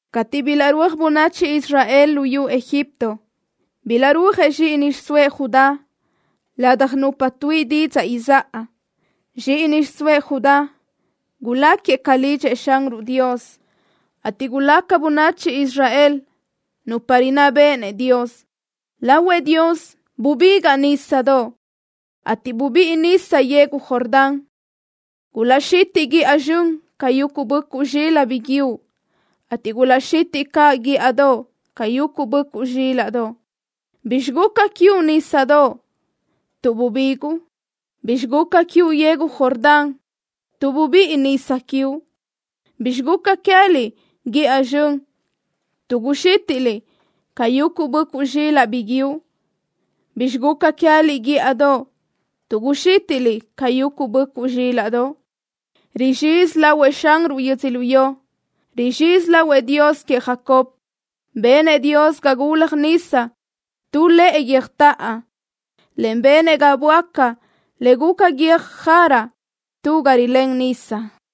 Cateʼ bilaʼrúaj bönachi Israel luyú Egipto bilaʼrúajëʼ zxíʼini xiʼsóëʼ Judá ladaj nupa tuíʼi didzaʼ izáʼa. Zxíʼini xiʼsóëʼ Judá guláquiëʼ ca lidxëʼ Xanruʼ Dios, ateʼ gulaca bönachi Israel nupa rinná béʼenëʼ Dios. Lahuëʼ Dios bubigaʼ nísadoʼ, ateʼ bubíʼi nisa yegu Jordán. Gulaʼxitiʼ guíʼa zxön ca yuguʼ böʼcuʼ zxilaʼ biguiúʼ, ateʼ gulaʼxitiʼ caʼ guíʼadoʼ ca yuguʼ böʼcuʼ zxílaʼdoʼ. ¿Bi raca quiuʼ, nísadoʼ, tuʼ rubiguʼ? ¿Bi raca quiuʼ, yegu Jordán, tuʼ rubíʼi nisa quiuʼ? ¿Bi raca queë́liʼ, guíʼa zxön, tuʼ rixítiʼliʼ ca yuguʼ böʼcuʼ zxilaʼ biguiúʼ? ¿Bi raca queë́liʼ, guíʼadoʼ, tuʼ rixítiʼliʼ ca yuguʼ böʼcuʼ zxílaʼdoʼ? Guzxizi lahuëʼ Xanruʼ, yödzölió. Guzxizi lahuëʼ Dios queëʼ Jacob. Benëʼ Dios ga gulaj nisa tu lëʼe guiö́jtoʼo, en benëʼ ga böáca le guca guiö́j jara tu ga rilén nisa.